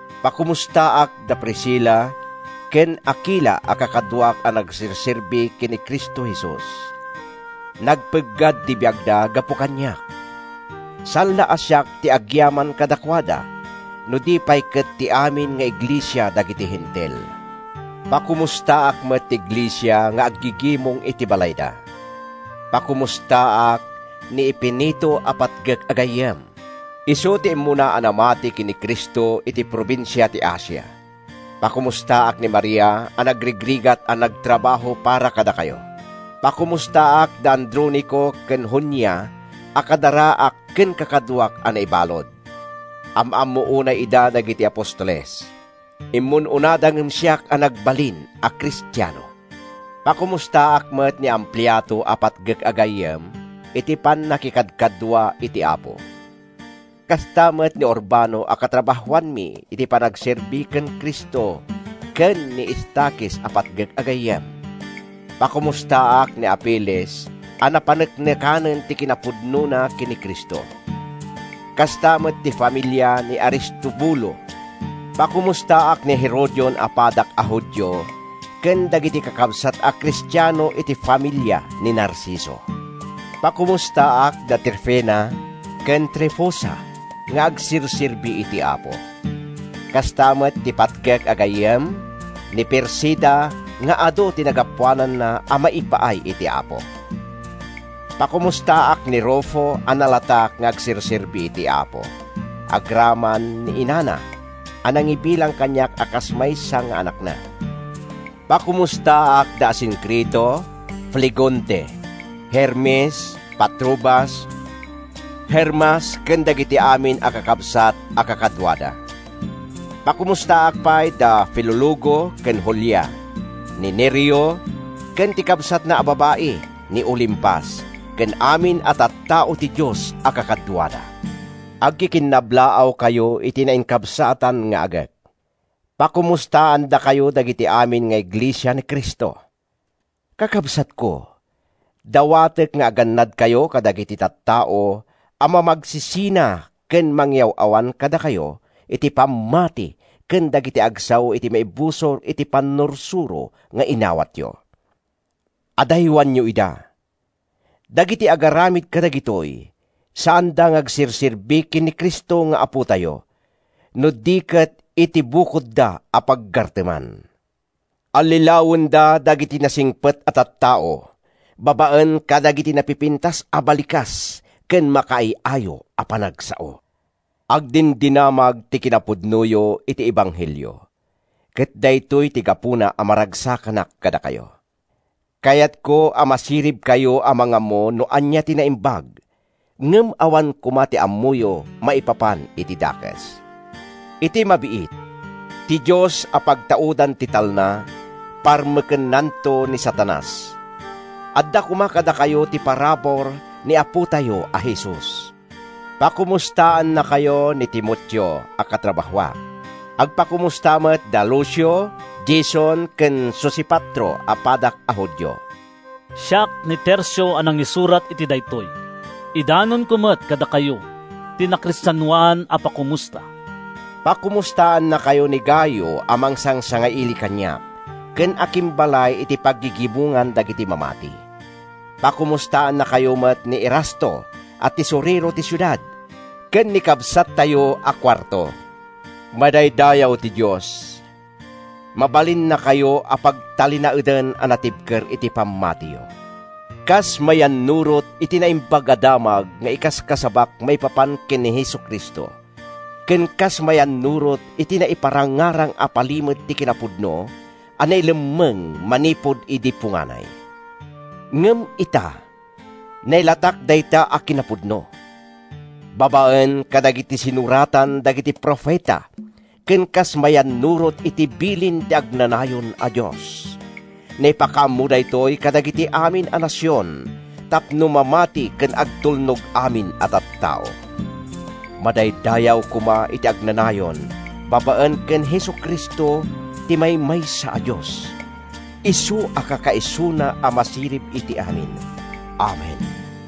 Pakomustaak da Priscila ken Akila a kakaduak a nagserserbi ken ni Cristo Jesus. Nagpeggad ti biagda gapu kaniak. Saan la a siak ti agyaman kadakuada no di pay ket ti amin nga iglesia dagiti Hentil. Pakomustaak met ti iglesia nga aggigimong iti balayda. Pakomustaak ni Epeneto a patgek a gayyem. Isu ti immuna a namati ken ni Cristo iti probinsia ti Asia. Pakomustaak ni Maria a nagrigrigat a nagtrabaho para kadakayo. Pakomustaak da Adronico ken Junia a kadaraak ken kakaduak a naibalud. Am-ammo unay ida dagiti apostoles. Immun-unada ngem siak a nagbalin a Kristiano. Pakomustaak met ni Ampliato a patgek a gayyem iti pannakikadkadua iti Apo. Kasta met ni Urbano a katrabahoanmi iti panagserbi ken Cristo ken ni Estakis a patgek a gayyem. Pakomustaak ni Apeles a napaneknekanen ti kinapudnona ken ni Cristo. Kasta met ti familia ni Aristobulo. Pakomustaak ni Herodion a padak a Judio ken dagiti kakabsat a Kristiano iti familia ni Narciso. Pakomustaak da Trifena ken Trifosa nga agserserbi iti Apo, kasta met ti patgek a gayyem, ni Persida nga adu ti nagapuananna a maipaay iti Apo. Pakomustaak ni Rufo a nalatak nga agserserbi iti Apo, agraman ni inana a nangibilang kaniak a kas maysa nga anakna. Pakomustaak da Asincrito, Flegonte, Hermes, Patrobas, Hermas ken dagiti amin a kakabsat a kakaduada. Pakomustaak pay da Filologo ken Julia, ni Nereo ken ti kabsatna a babai, ni Olimpas, ken amin a tattao ti Dios a kakaduada. Agkikinnablaawkayo iti nainkabsatan nga agek. Pakomustaandakayo dagiti amin nga iglesia ni Cristo. Kakabsatko, dawatek nga agannadkayo kadagiti tattao a mamagsisina ken mangyaw-awan kadakayo iti pammati ken dagiti agsao iti maibusor iti pannursuro nga inawatyo. Adaywanyo ida. Dagiti agaramid kadagitoy, saanda nga agserserbi ken ni Cristo nga Apotayo, no di ket iti bukodda a paggarteman. Allilawenda dagiti nasingpet a tattao babaen kadagiti napipintas a balikas ken makaay-ayo a panagsao. Agdindinamag ti kinapudnoyo iti ebanghelio, ket daytoy ti gapuna a maragsakanak kadakayo. Kayatko a masiribkayo a mangammo no ania ti naimbag, ngem awan koma ti ammoyo maipapan iti dakes. Iti mabiit, ti Dios a pagtaudan ti talna, parmekennanto ni Satanas. Adda koma kadakayo ti parabur ni Apotayo a Jesus. Pakomustaannakayo ni Timoteo a katrabahoak. Agpakomusta met da Lucio, Jason ken Sosipatro a padak a Judio. Siak, ni Tercio a nangisurat iti daytoy, idanonko met kadakayo ti nakristianoan a pakomusta. Pakomustaannakayo ni Gayo a mangsangsangaili kaniak ken akimbalay iti paggigimongan dagiti mamati. Pakomustaannakayo met ni Erasto a tesorero ti siudad, ken ni kabsattayo a Cuarto. Madaydayaw ti Dios! Mabalinnakayo a pagtalinaeden a natibker iti pammatiyo, kas mayannurot iti Naimbag a Damag nga ikaskasabak maipapan ken Jesu-Cristo, ken kas mayannurot iti naiparangarang a palimed ti kinapudno a nailemmeng manipud idi punganay. Ngem ita, nailatak dayta a kinapudno. Babaen kadagiti sinuratan dagiti profeta ken kas mayannurot iti bilin ti agnanayon a Dios, naipakaammo daytoy kadagiti amin a nasion tapno mamati ken agtulnog amin a tattao. Madaydayaw koma iti agnanayon babaen ken Jesu-Cristo ti maymaysa a Dios, isu a kakaisuna a masirib iti amin! Amen.